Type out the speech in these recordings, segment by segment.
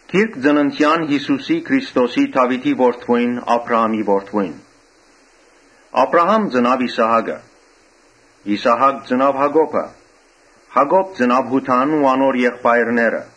Գիրք ծնունդին Յիսուսի Քրիստոսի՝ Դաւիթի որդիին, Աբրահամի որդիին։ Աբրահամ ծնաւ Իսահակը. Իսահակ ծնաւ Յակոբը. Յակոբ ծնաւ Յուդան ու անոր եղբայրները.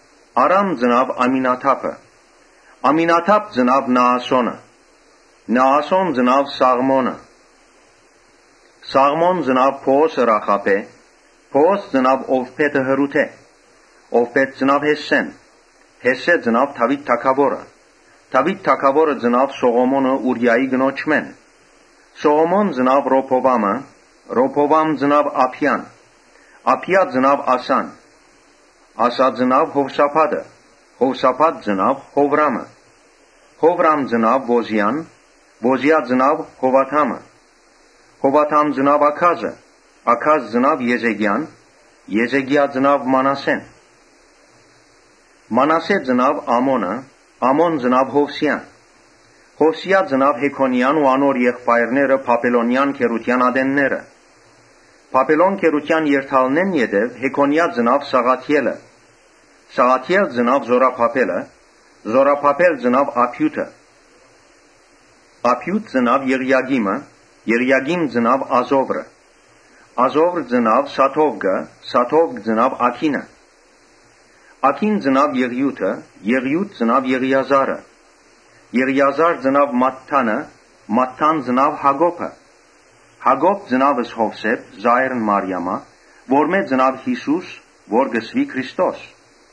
Արամ ծնաւ Ամինադաբը. Ամինադաբ ծնաւ Նաասոնը. Նաասոն ծնաւ Սաղմոնը. Սաղմոն ծնաւ Բոոսը Ռախաբէն. Բոոս ծնաւ Ովբէդը Հռութէն. Ովբէդ ծնաւ Յեսսէն. Յեսսէ ծնաւ Դաւիթ թագաւորը. Դաւիթ թագաւորը ծնաւ Սողոմոնը Ուրիայի կնոջմէն. Սողոմոն ծնաւ Ռոբովամը. Ռոբովամ ծնաւ Աբիան. Աբիա ծնաւ Ասան. Ասա ծնաւ Յովսափատը. Յովսափատ ծնաւ Յովրամը. Յովրամ ծնաւ Ոզիան. Ոզիա ծնաւ Յովաթամը. Յովաթամ ծնաւ Աքազը, Աքազ ծնաւ Եզեկիան. Եզեկիա ծնաւ Մանասէն. Մանասէ ծնաւ Ամոնը. Ամոն ծնաւ Յովսիան. Յովսիա ծնաւ Յեքոնիան ու անոր եղբայրները Բաբելոնեան գերութեան ատենները. Բաբելոն գերութեան երթալէն յետոյ Յեքոնիա ծնաւ Սաղաթիէլը. Սաղաթիէլ՝ Զօրաբաբէլը. Զօրաբաբէլ ծնաւ Աբիուդը. Աբիուդ ծնաւ Եղիակիմը. Եղիակիմ ծնաւ Ազովրը. Ազովր ծնաւ Սադովկը. Սադովկ ծնաւ Աքինը. Աքին ծնաւ Եղիուդը. Եղիուդ ծնաւ Եղիազարը. Եղիազար ծնաւ Մատթանը. Մատթան ծնաւ Յակոբը. Յակոբ ծնաւ Յովսէփը՝ Մարիամին այրը, որմէ ծնաւ Յիսուս, որ կոչուեցաւ Քրիստոս։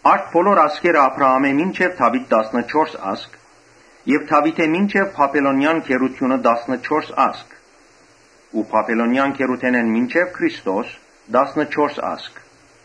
Արդ բոլոր սերունդները Աբրահամէն մինչեւ Դաւիթ տասնըչորս սերունդ եւ Դաւիթէն մինչեւ Բաբելոնեան գերութիւնը տասնըչորս սերունդ ու Բաբելոնեան գերութենէն մինչեւ Քրիստոս տասնըչորս սերունդ։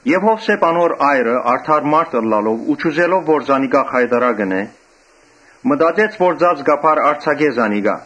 Յովսէփ՝ անոր այրը՝ արդար մարդ ըլլալով ու չուզելով որ զանիկա խայտառակ ընէ, մտածեց որ ծածկաբար արձակէ զանիկա։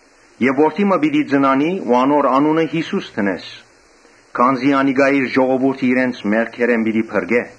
Ան որդի մը պիտի ծնանի, անոր անունը Այսինքն, ՓրկիչՅիսուս պիտի դնես, քանզի անիկա իր ժողովուրդը իրենց մեղքերէն պիտի փրկէ»։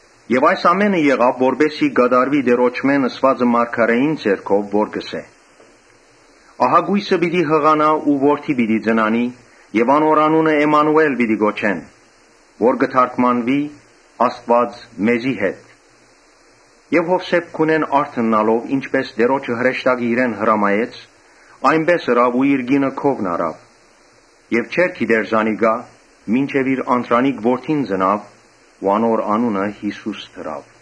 Այս ամէնը եղաւ, որպէս զի կատարուի Տէրոջմէն ըսուածը մարգարէին միջոցով, որ կ’ըսէ. «Ահա կոյսը պիտի յղանայ ու որդի պիտի ծնանի, անոր անունը Էմմանուէլ պիտի կոչեն, որ կը թարգմանուի Աստուած մեզի հետ»։ Յովսէփ քունէն արթննալով՝ ինչպէս Տէրոջը հրեշտակը իրեն հրամայեց, այնպէս ըրաւ ու իր կինը քովն առաւ։ Եւ չգիտցաւ զանիկա՝ մինչեւ իր անդրանիկ որդին ծնաւ։ Անոր անունը Յիսուս դրաւ։